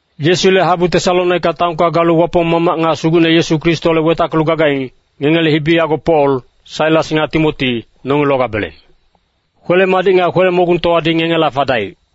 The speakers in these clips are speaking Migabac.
Yesule habu Tesalonika taonka galu Wapong Mamac nga Sugucne Yesu Kristoholec wetackelu gagaing, ngengele hibi yago Pol, Sailas nga Timoti, nongi logabeleng. Kwele-madic nga kwele-mogungtowadi ngengela fadaic.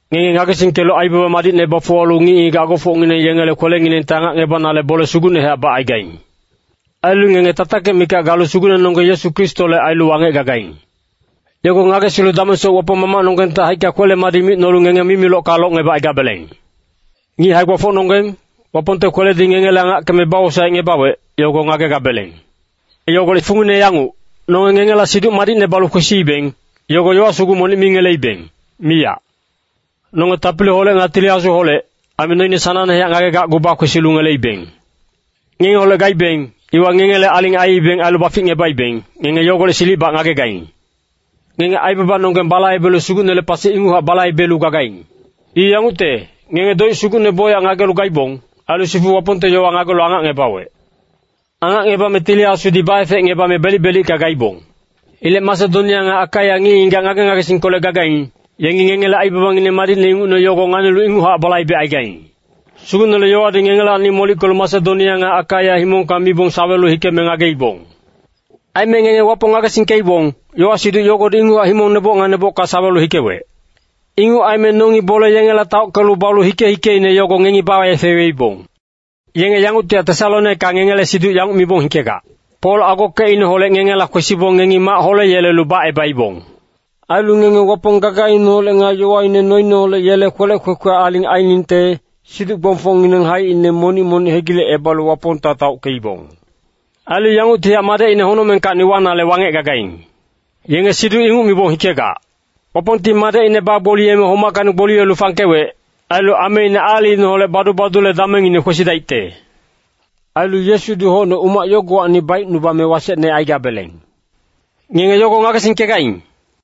Ngenge ngagesingkelu aibaba madicne bafuwalu ngic-ngigac agofocngineng yengele kwelenginengti angacngebanale bole sugucnehac bacaigaing. Ailu ngenge tatakic mikac galu Sugucnenonggeng Yesu Kristole ailu wangec gagaing. Yogo ngagesilu damengsoc Wapong Mamacnonggengte haicka kwele-madic micnolu ngenge mimilocka locngebacaigabeleng. Ngic hae-gbafocnonggeng, Wapongte kweledi ngengele angackeme bawosaecngebawec, yogo ngagegabeleng. Yogolec fungine yanguc, nonge ngengela Siduc Madicne balu kwesiibeng, yogo yowa sugu monic mi ngeleibeng, miyac. Nonge tapiliholec nga Tili Asuholec, aime noine sanangnehac ngagegacgu bakwesilu ngeleibeng. Ngengeholec gaibeng, iwa ngengele aling aiibeng ailu baficngebaibeng, ngenge yogolec silicbac ngagegaing. Ngenge aibabanonggeng balaibelu Sugucnele pasi inguchac balaibelu gagaing. I yangucte, ngenge doic sugucne bocyac ngagelu gaibong. Ailu sifu Wapongte yowa ngagelu angacngebawec. Angacngebame Tili Asudi baefecngebame belic-belicka gaibong. Ilec Masedonia nga Akaia ngic-ngigac ngage-ngagesingkolec gagaing, yengi ngengele aibabangineng madicne ingucne yogo nganilu inguchac balaibecaigaing. Sugucnele yowadi ngengelacni molickelu Masedonia nga Akaia himongka mibong sawelu hikeme ngageibong. Aime ngenge Wapong ngagesingkeibong, yowa-siduc yogodi inguchac himong neboc nga nebocka sawelu hikewec. Inguc aime nongi bole yengela taockelu balu hike-hikeine yogo ngengi baefeweibong. Yenge yengungtihac Tesalonika ngengele siduc yanguc mibong yegengkelu hikegac, “Pol agokecineholec ngengela kwesibong ngengi mac holeyelelu bacebaibong. Ailu ngenge Wapong gagaineholec nga yowaine noineholec yele kwelec kwekwe aling ainingte, siduc-gbongfocngineng haicine monic-monic hegilecebalu Wapongta taockeibong. Ailu yanguctihac Madecine honocmengkacni wanale wangec gagaing.” Yenge siduc inguc mibong hikegac. Wapongti Madecine bagboliyeme homackacni gboliyelu fangkewec. Ailu ameine aalicineholec badu-badule damengine kwesidaicte. Ailu Yesudi hocne umac yogowacni baicnubame wasecne aigabeleng. Ngenge yogo ngagesingkegaing.